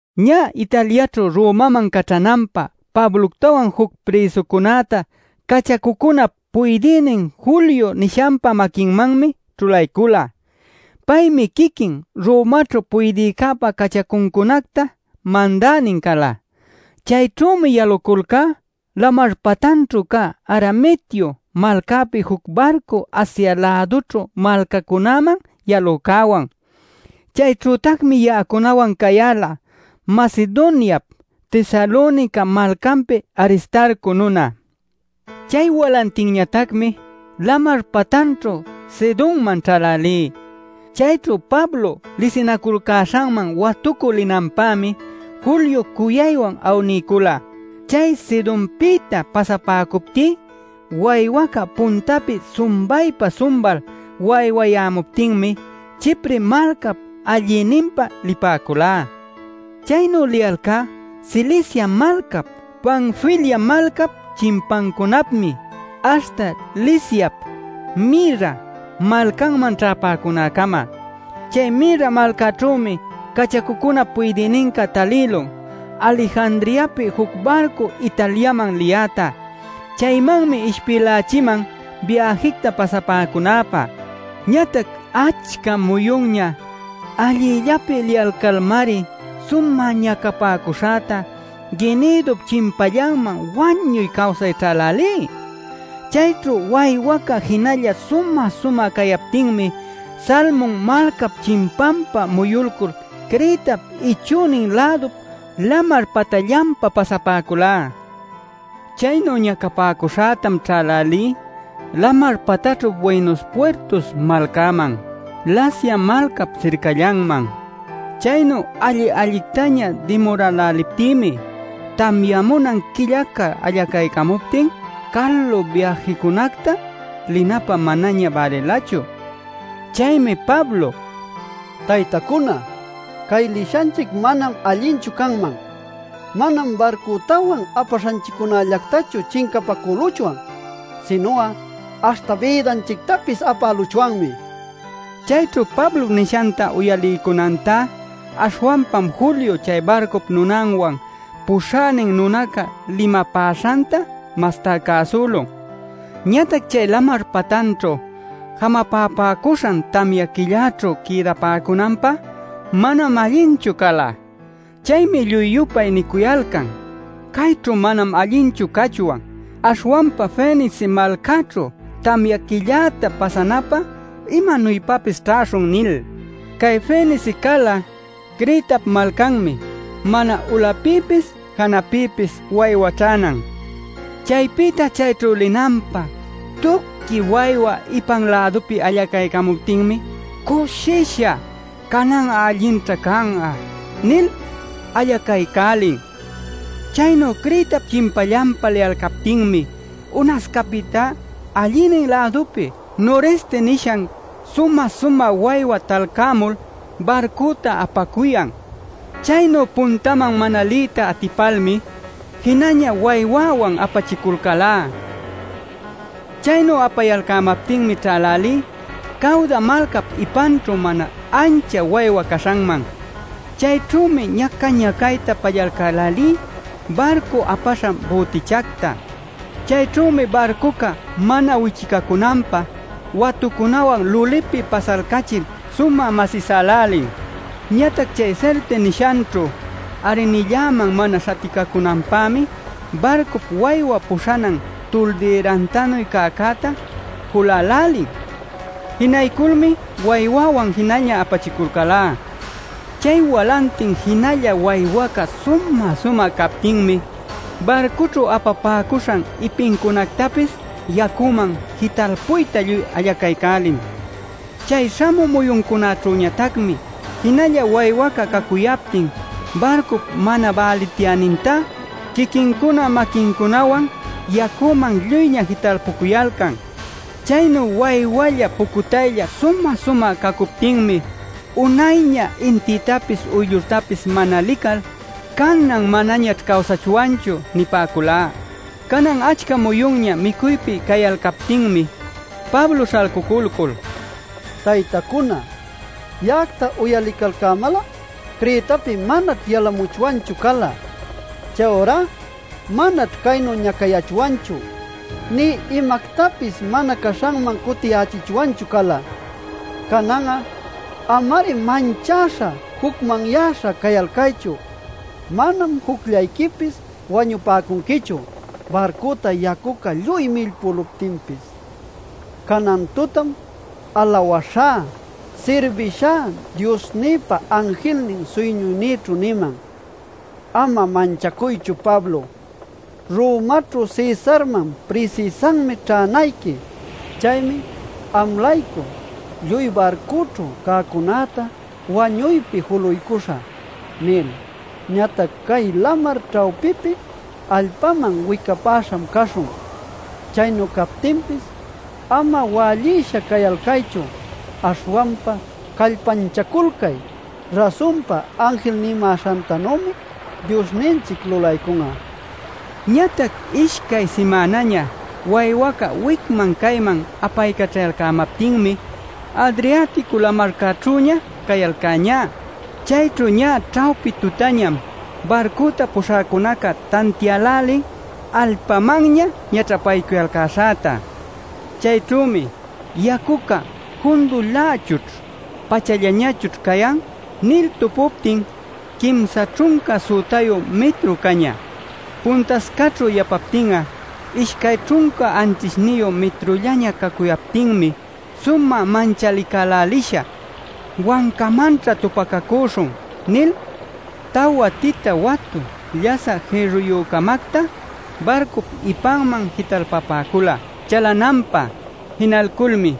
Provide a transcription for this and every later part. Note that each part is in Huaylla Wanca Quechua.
Ñä Italiaćhu Romaman caćhananpä Pabloctawan juc prïsucunäta cachacucunap puydïnin Julio nishanpa maquinmanmi ćhulaycula. Paymi quiquin Romaćhu puydïcäpa cachacuncunacta mandänin cala. Chayćhümi yaluculcá lamar patanćhu cä Adramitio malcäpi juc barcu Asia-lädućhu malcacunaman yalücäwan. Chayćhütacmi ya'acunawan cayäla Macedoniap Tesalonica malcanpi Aristarco nuna. Chay walantinñatacmi lamar patanćhu Sidonman ćhälälí. Chayćhu Pablo lisinaculcäśhanman watucü linanpämi Julio cuyaywan awniycula. Chay Sidonpïta pasapäcuptí waywaca puntapi sumbaypa-sumbal waywacayämuptinmi Chipre malcap allïninpa lipäculá. Chaynu liyalcá Cilicia malcap, Panfilia malcap chimpancunapmi aśhta Liciap Mira malcanman ćhäpäcunäcama. Chay Mira malcäćhümi cachacucunap puydïninca talïlun Alejandriapi juc barcu Italiaman liyäta. Chaymanmi ishpïlächiman biäjicta pasapäcunäpä. Ñatac achca muyunña allillapi liyalcalmari sumä ñacapäcuśhäta Gnidup chimpallanman wañuy cawsay ćhälälí. Chayćhu waywaca jinalla sumä-sumä cayaptinmi Salmun malcap chimpanpa muyulcul Cretap ichünin lädup lamar patanllanpa pasapäculá. Chaynu ñacapäcuśhätam ćhälälí lamar patanćhu Buenos Puertos malcäman, Lasea malcap sircallanman. Chaynu alli-allictaña dimuräläliptïmi tamyamunan quillaca allacaycamuptin calu biäjicunacta linapä manaña bälilachu. Chaymi Pablo: “Taytacuna, cay lishanchic manam allinchu canman. Manam barcütawan apaśhanchiccunällactachu chincapacüluchwan, sinu'a aśhta bïdanchictapis apäluchwanmi” nila. Chayćhu Pablop nishanta uyaliycunantá aśhwanpam Julio chay barcup nunanwan puśhänin nunaca limapäśhanta mastá cäsülun. Ñatac chay lamar patanćhu jamapapäcuśhan tamya quillaćhu quïdapäcunanpä manam allinchu cala. Chaymi lluy-yupay nicuyalcan: “Cayćhu manam allinchu cachwan. Aśhwanpa Fenice malcäćhu tamya quilläta pasanapä imanuypapis ćhäśhun” nil. (Cay Fenice cala Cretap malcanmi mana ulapïpis janapïpis waywa ćhänan.) Chaypïta chayćhu linanpä tuqui waywa ipan lädupi allaycämuptinmi cushisha: “Canan allinćha can'a” nil allacaycälin. Chaynu Cretap chimpallanpa liyalcaptinmi unascapïtá allïnin lädupi Noreste nishan sumä-sumä waywa talcämul barcüta apacuyan. Chaynu puntaman mana liyta atipalmi, jinaña waywäwan apachiculcälá. Chaynu apayalcämaptinmi ćhälälí Cawda malcap ipanćhu mana ancha waywa caśhanman. Chayćhümi ñaca-ñacayta pallalcälälí barcu apaśhan bütichacta. Chayćhümi barcuca mana wichicacunanpä watucunawan lulipi pasalcachil sumä masïsälälin. Ñatac chay Sirte nishanćhu arrinilläman mana śhaticacunanpämi barcup waywa puśhanan tuldïrantanuy cäcäta julälälin. Jinayculmi waywäwan jinaña apachiculcälá. Chay walantin jinalla waywaca sumä-sumä captinmi barcüćhu apapäcuśhan ipincunactapis yacüman jitalpuyta lluy allacaycälin. Chay śhamü muyuncäćhüñatacmi jinalla waywaca cacuyaptin barcup mana bälityänintá quiquincuna maquincunawan yacüman lluyña jitalpücuyalcan. Chaynu waywalla pucutaylla sumä-sumä cacuptinmi unayña intïtapis uyllurtapis mana lical: “Canan manañaćh cawsachwanchu” nipäculá. Canan achca muyunña micuypi cayalcaptinmi Pablo śhalcuculcul: “Taytacuna, ya'acta uyalicalcämal'a Cretapi manaćh yalamuchwanchu cala. Chayurá manaćh caynu ñacayachwanchu, nï imactapis mana caśhanman cutichichwanchu cala. Canan'a ama-ari manchäśha jucmanyäśha cayalcaychu. Manam jucllayquipis wañupäcunquichu barcüta yacuca lluy millpüluptinpis. Canan tutam alawaśhá sirbishá Diosnïpa anjilnin suyñuynïćhu niman: ‘Ama manchacuychu Pablo, Romaćhu Cesarman prisïsanmi ćhänayqui. Chaymi am-laycu lluy barcüćhu cäcunäta wañuypi juluycuśhä’ nil. Ñatac cay lamar ćhawpipi allpäman wicapäśham caśhun. Chaynu captinpis ama wällisha cayalcaychu. Aśhwanpa callpanchaculcay. Rasunpa anjil nimäśhantanümi Diosninchic lulaycun'a” nila. Ñatac ishcay simänaña waywaca wicman cayman apaycaćhayalcämaptinmi Adriatico lamarcäćhüña cayalcäñá. Chayćhu ñä ćhawpi tutañam barcüta puśhäcunaca tantiälälin allpamanña ñaćhapaycuyalcäśhäta. Chayćhümi yacuca “Jundulächućh pachallañachućh cayan” nil tupuptin quimsa ćhunca sütayu mitru cañä. Puntascaćhu yapaptin'a ishcay ćhunca anćhishniyu mitrullaña cacuyaptinmi sumä manchalicälälisha: “Wancamanćha tupacacüśhun” nil tawa tita watu llasä jïrruyü-camacta barcup ipanman jitalpapäcula chalalänanpä. Jinalculmi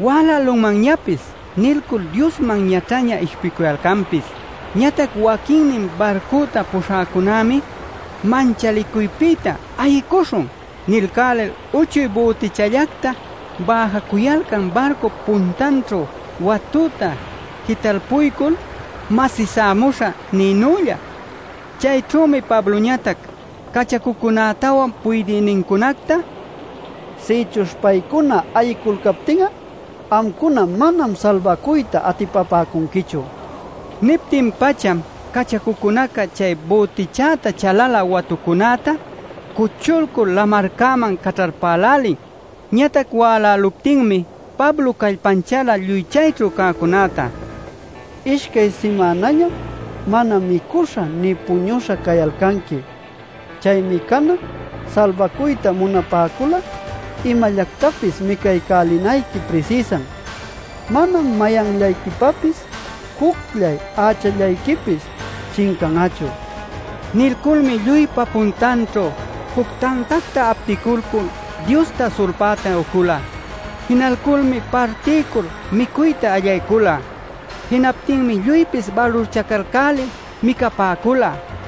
“Wälälunmanñapis” nilcul Diosman ñaćhaña ishpicuyalcanpis. Ñatac waquinnin barcüta puśhäcunämi manchalicuypïta “Ayicuśhun” nilcälil uchuy bütichallacta bäjacuyalcan barcup puntanćhu watüta jitalpuycul “masïsämuśhä” nïnülla. Chayćhümi Pabloñatac cachacucunätawan puydïnincunacta: “Sïchuśh paycuna ayiyculcaptin'a amcuna manam salbacuyta atipapäcunquichu” nila. Niptin-pacham cachacucunaca chay bütichäta chalalä watucunäta cuchulcul lamarcäman caćhalpaycälälin. Ñatac wäläluptinmi Pablo callpanchäla lluy chayćhu cäcunäta: “Ishcay simänañam mana micuśha nï puñuśha cayalcanqui. Chaymi canan salbacuyta munapäcul'a imallactapis micaycälinayqui prisïsan. Manam mayanniquipapis jucllay ächallayquipis chincan'achu” nila. Nilculmi lluypa puntanćhu juc tantacta apticulcul Diosta sulpäta ucula. Jinalculmi partiycul micuyta allaycula. Jinaptinmi lluypis balurchacalcälil micapäcula.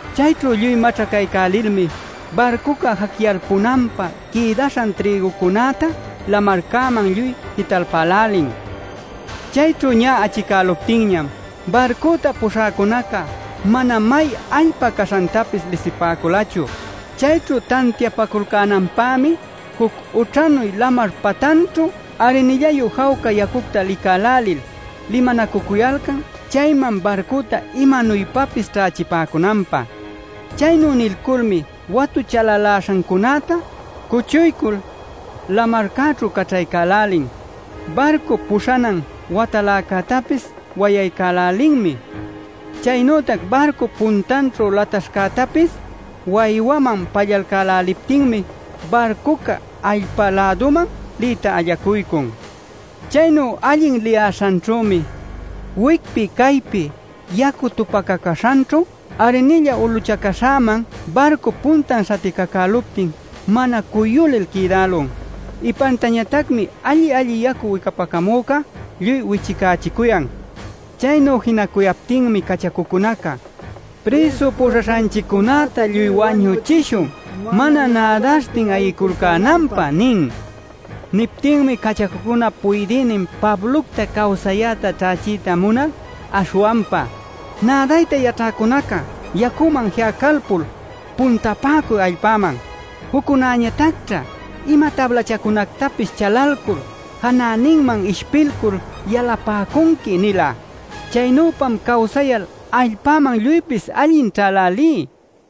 Chayćhu lluy maćhacaycälilmi barcuca jacyalpunanpä quïdaśhan trïgucunäta lamarcäman lluy jitalpälälin. Chayćhu ñä achicäluptinñam barcüta puśhäcunaca mana may allpa caśhantapis lisipäculachu. Chayćhu tantiapaculcänanpämi juc ućhanu lamar patanćhu arrinillayu jawca yacucta licälälil limanacucuyalcan chayman barcüta imanuypapis ćhächipäcunanpä. Chaynu nilculmi watü chalaläśhancunäta cuchuycul lamarcäćhu caćhaycälälin. Barcup puśhanan wataläcätapis wayaycälälinmi. Chaynütac barcup puntanćhu lataśhcätapis waywäman pallalcäläliptinmi barcuca allpa-läduman liyta allacuycun. Chaynu allin liyäśhanćhümi wicpi caypi yacu tupacacäśhanćhu arrinilla uluchacäśhäman barcup puntan śhaticacüluptin mana cuyulil quïdälun. Ipantañatacmi alli-alli yacu wicapacamüca lluy wichicächicuyan. Chaynu jinacuyaptinmi cachacucunaca: “Prïsu puśhaśhanchicunäta lluy wañuchishun mana nädaśhtin ayiyculcänanpä” nin. Niptinmi cachacup puydïnin Pablocta cawsayäta ćhächiyta munal aśhwanpa: “Nädayta yaćhäcunacá yacüman ji'alcalpul puntapäcuy allpäman. Juccunäñatacćha ima tablachacunactapis chalalcul janäninman ishpilcul yalapäcunqui” nila. Chaynüpam cawsayal allpäman lluypis allin ćhälälí.